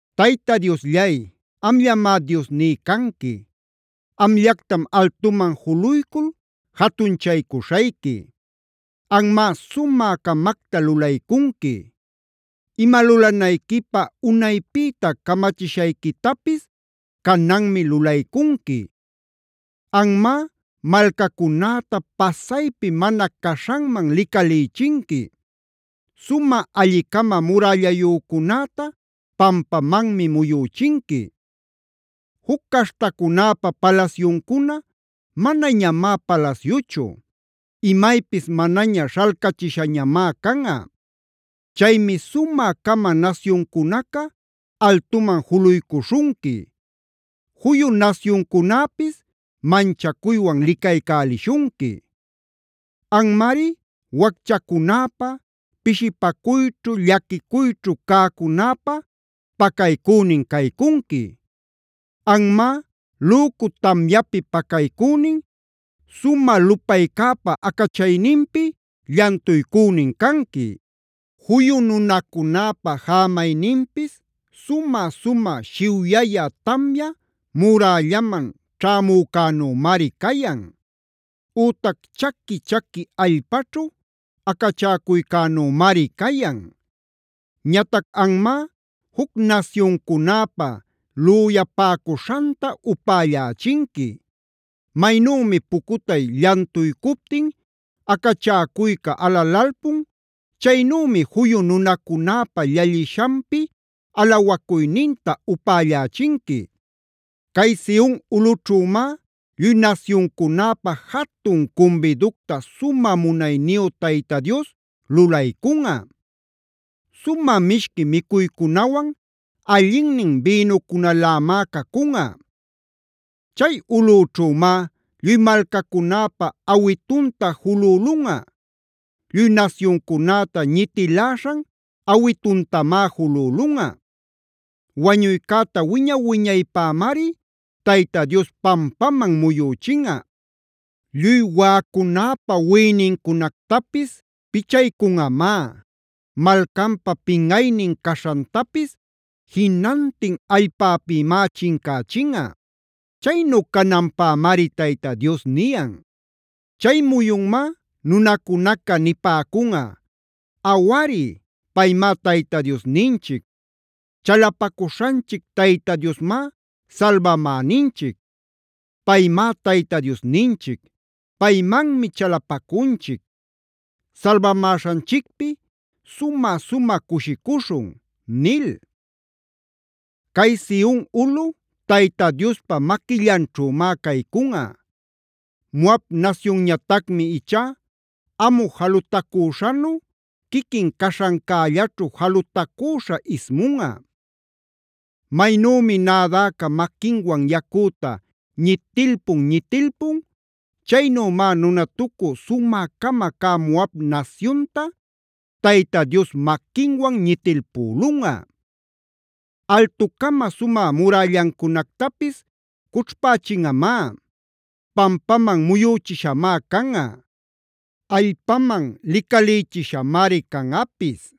Tayta Diosllay, amllamá Diosní canqui. Amllactam altuman juluycul jatunchaycuśhayqui. Anmá sumä-camacta lulaycunqui; ima lulanayquipä unaypïta camachishayquitapis cananmi lulaycunqui. Anmá, malcacunäta pasaypi mana caśhanman licalïchinqui; sumä alli-cama murällayücunäta pampamanmi muyüchinqui. Juc caśhtacunäpa palasyuncuna manañamá palasyuchu; imaypis manaña śhalcachishañamá canꞌa. Chaymi sumä-cama nasyuncunaca altuman juluycuśhunqui; juyu nasyuncunäpis manchacuywan licaycälishunqui. Anmari wacchacunäpa, pishipacuyćhu, llaquicuyćhu cäcunäpa pacaycünin caycunqui. Anmá lücu tamyapi pacaycünin, sumä lupaycäpa acachayninpi llantuycünin canqui. Juyu nunacunäpa jämayninpis sumä-sumä shiwyaya tamya murällaman ćhämücänümari cayan; ütac chaqui-chaqui allpaćhu acachäcuycänumari cayan. Ñatac anmá juc nasyuncunäpa lüyapäcuśhanta upällächinqui. Maynümi pucutay llantuycuptin acachäcuyca alalalpun, chaynümi juyu nunacunäpa llallishanpi alawacuyninta upällächinqui. Cay Sion ulꞌućhümá lluy nasyuncunäpa jatun cumbiducta sumä munayniyu Tayta Dios lulaycunꞌa. Sumä mishqui micuycunawan allinnin bïnucunalämá cacunꞌa. Chay ulꞌućhümá lluy malcacunäpa awitunta julülunꞌa; lluy nasyuncunäta ñitiläśhan awituntamá julülunꞌa. Wañuycäta wiña-wiñaypämari Tayta Dios pampaman muyüchinꞌa.a Lluy waꞌacunäpa wiꞌinincunactapis pichaycunꞌamá;b malcanpa pinꞌaynin caśhantapis jinantin allpäpïmá chincächinꞌa. Chaynu cananpämari Tayta Dios niyan. Chay muyunmá nunacunaca nipäcunꞌa: “¡Awari, paymá Tayta Diosninchic! ¡Chalapacuśhanchic Tayta Diosmá salbamäninchic! ¡Paymá Tayta Diosninchic! ¡Paymanmi chalapacunchic! ¡Salbamäśhanchicpi sumä-sumä cushicuśhun!” nil. Cay Sion ulꞌu Tayta Diospa maquillanćhümá caycunꞌa. Moabc nasyunñatacmi ichá amu jalutacüśhanu quiquin caśhancällaćhu jalutacüśha ismunꞌa. Maynümi nädäca maquinwan yacüta ñitilpun-ñitilpun, chaynümá nunatucü sumä-cama cä Moab nasyunta Tayta Dios maquinwan ñitilpülulunꞌa. Altu-cama sumä murällancunactapis cućhpächinꞌamá. Pampaman muyüchishamá canꞌa. Allpaman licalïchishamari canꞌapis.